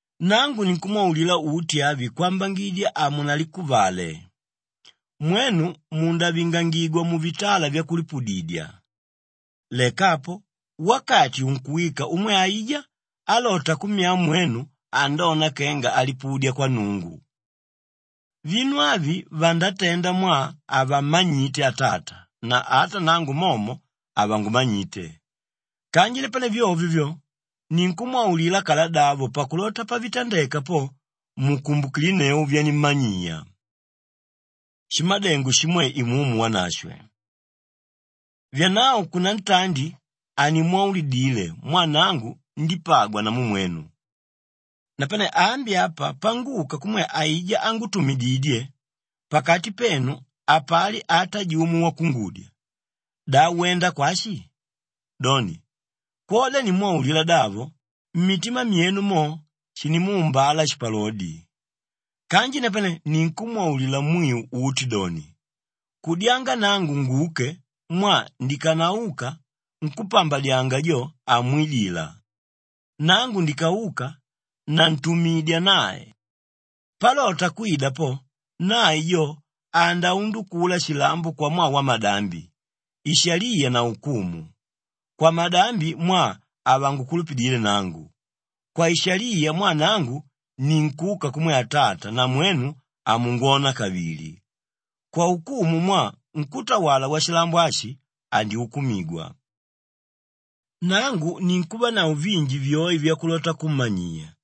“Nangu ninkumwaulila uti avi kwambangidya hamunalikuvale. Mwenu mundavingigwa muvitala vyakulipudidya; leka apo, wakati unkuwika umwe aijá álota kummyaa mwenu andona kenga alipudya kwa Nnungu. Vinu avi vandatenda mwaa havammanyite Atata na ata nangu momo havangumanyite. Kanji napane vyovyo vyo, ninkumwaulila kaladavo pakulota pavitandeka po, mukumbukilinneu vyanimmanyiya. Shimadengo shimwe Imumu Wanashwe “Vyanavo kunantandi hanimwaulidile mwaa nangu ndípagwa namu mwenu. Napane ambi apa panguka kumwe aijá ángutumididye, pakati penu hapali ata jumo wakungudya, ‘Da wenda kwashi?’ Doni, kwoda nimwaulila davo, mmitima myenu mo shinimuumbala shipalodi. Kanji napane ninkumwaulila mwiu uti doni, kudyanga nangu nguke mwaa ndikanauka, nkúpambadyanga jo hamwidila; nangu ndikauka, nantumidya nae. Palota kwida po, nae jo andaundukula shilambo kwamwaa wamadambi, ishaliya na ukumu; kwamadambi mwaa havangukulupidile nangu; kwaishaliya mwaa nangu ninkuka kumwe Atata na mwenu hamungwona kavili; kwaukumu mwaa nkútawala washilambo ashi andyukumigwa. “Nangu ninkuvanavo vinji vyoe vyakulota kummanyiya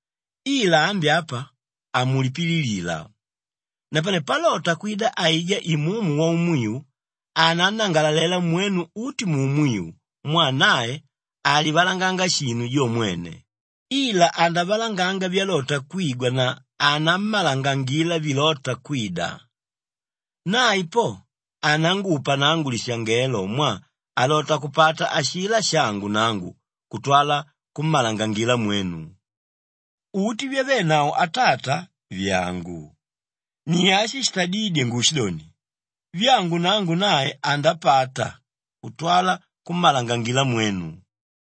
ila ambi apa, hamulipililila. Napane palota kwida aijá Imumu Waumwiu anannangalalela mwenu uti muumwiu mwaa nae halivalanganga shinu jo mwene, ila andavalanganga vyalota kwigwa na anammalangangila vilóta kwida. Nae po anangupa nangu lishangelo mwaa alota kupata ashilá shangu nangu kutwala kummalangangila mwenu. Uti vyavenavo Atata, vyàngu. Ni ashi shitadídye nguushidoni, vyangu nangu nae andapata kutwala kummalangangila mwenu.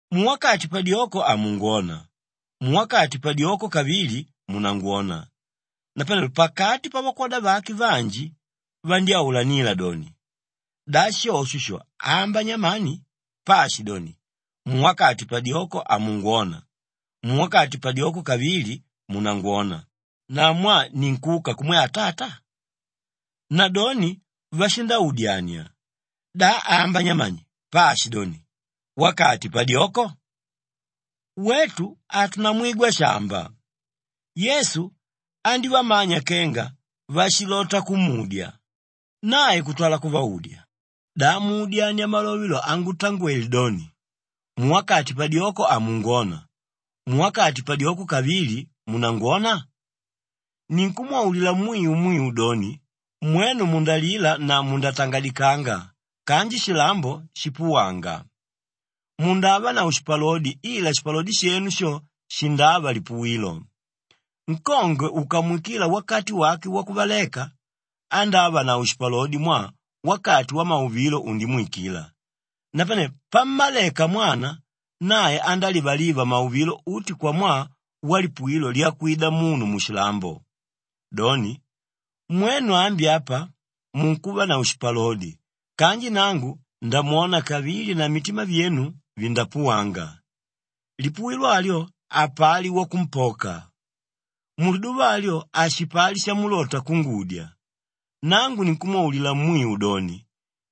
“Muwakati padyoko hamungwona; muwakati padyoko kavili, munangwona.” Napanelo pakati pavakwoda vake vanji vandyáulanila doni, “Da shosho sho amba nyamani paashidoni, ‘Muwakati padyoko hamungwona; muwakati padyoko kavili, munangwona,’ na, ‘Mwaa ninkuka kumwe Atata’?” Nadoni vashindaudyania, “Da amba nyamani paashidoni, ‘Wakati padyoko’? Wetu hatunamwigwa shámba.” Yesu andívamanya kenga vashilota kumudya, nae kutwala kuvaudya, “Da muudyania malove lo angutangwele doni, ‘Muwakati padyoko hamungwona; muwakati padyoko kavili, munangwona?’ Ninkumwaulila mwiu mwiu doni, mwenu mundalila na mundatangadikanga kanji shilambo shipuwanga. Mundavanavo shipalodi ila shipalodi shenu sho shindava lipuwilo. Nkongwe ukamwikila wakati wake wakuvaleka, andávanavo shipalodi mwaa wakati wamauvilo undimwikila. Napane pammaleka mwana, nae andálivaliva mauvilo uti kwamwaa walipuwilo lyakwida munu mushilambo. Doni, mwenu ambi apa munkuvanavo shipalodi kanji nangu ndamwona kavili na mitima vyenu vindapuwanga, lipuwilo alyo hapali wakumpoka. Muliduva alyo hashipali shamulota kungudya. Nangu ninkumwaulila mwiu doni,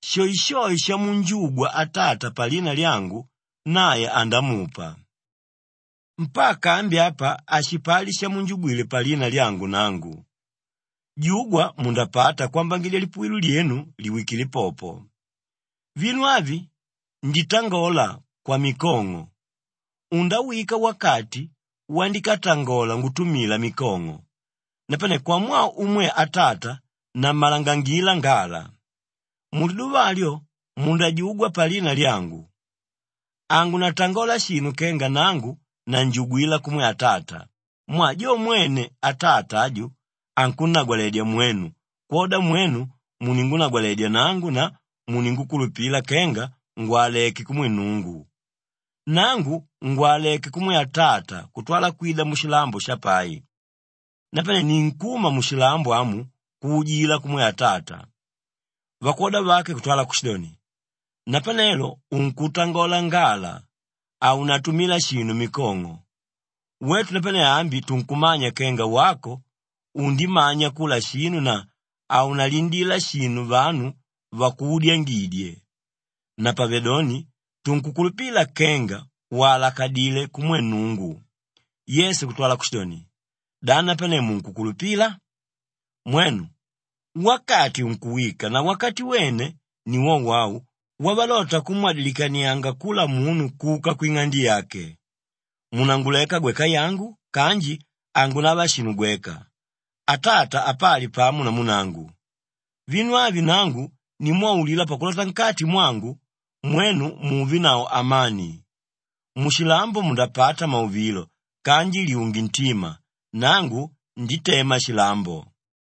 shoeshoe shamunjugwa Atata palina lyangu, nae andamupa. Mpaka ambi apa hashipali shamunjugwile palina lyangu nangu. Jugwa mundapata kwambangidya lipuwilo lyenu liwikile popo. “Vinu avi nditangola kwamikong'o; undawika wakati wandikatangola ngutumila mikong'o, napane kwamwaa umwe Atata nammalangangila ngala. Muliduva alyo mundajugwa palina lyangu. Hangunatangola shinu kenga nangu nanjugwila kumwe Atata mwaa jo mwene Atata aju ankunnagwaledya mwenu kwoda mwenu muningunagwaledya nangu na muningukulupila kenga ngwaleké kumwe Nnungu. Nangu ngwaleké kumwe Atata kutwala kwida mushilambo shapai, napane ninkuma mushilambo amu kuujila kumwe Atata.” Vakwoda vake kutwala kushidoni, “Napanelo unkutangola ngala haunatumila shinu mikong'o. Wetu napane ambi tunkumanya kenga wako undimanya kula shinu na haunalindila shinu vanu vakuudyangidye. Napavedoni tunkukulupila kenga walakadilé kumwe Nnungu.” Yesu kutwala kushidoni, “Da napane munkukulupila? Mwenu! Wakati unkuwika na wakati wene ni wowo au wavalota kummwadilikanianga kula munu kuka kwing'ande yake. Munanguleka gweka yangu kanji hangunava shinu gweka, Atata apali pamo namu nangu. Vinu avi nangu nimwaulila pakulota nkati mwangu, mwenu muvenavo amani. Mushilambo mundapata mauvilo kanji lyunge ntima; nangu nditema shilambo.”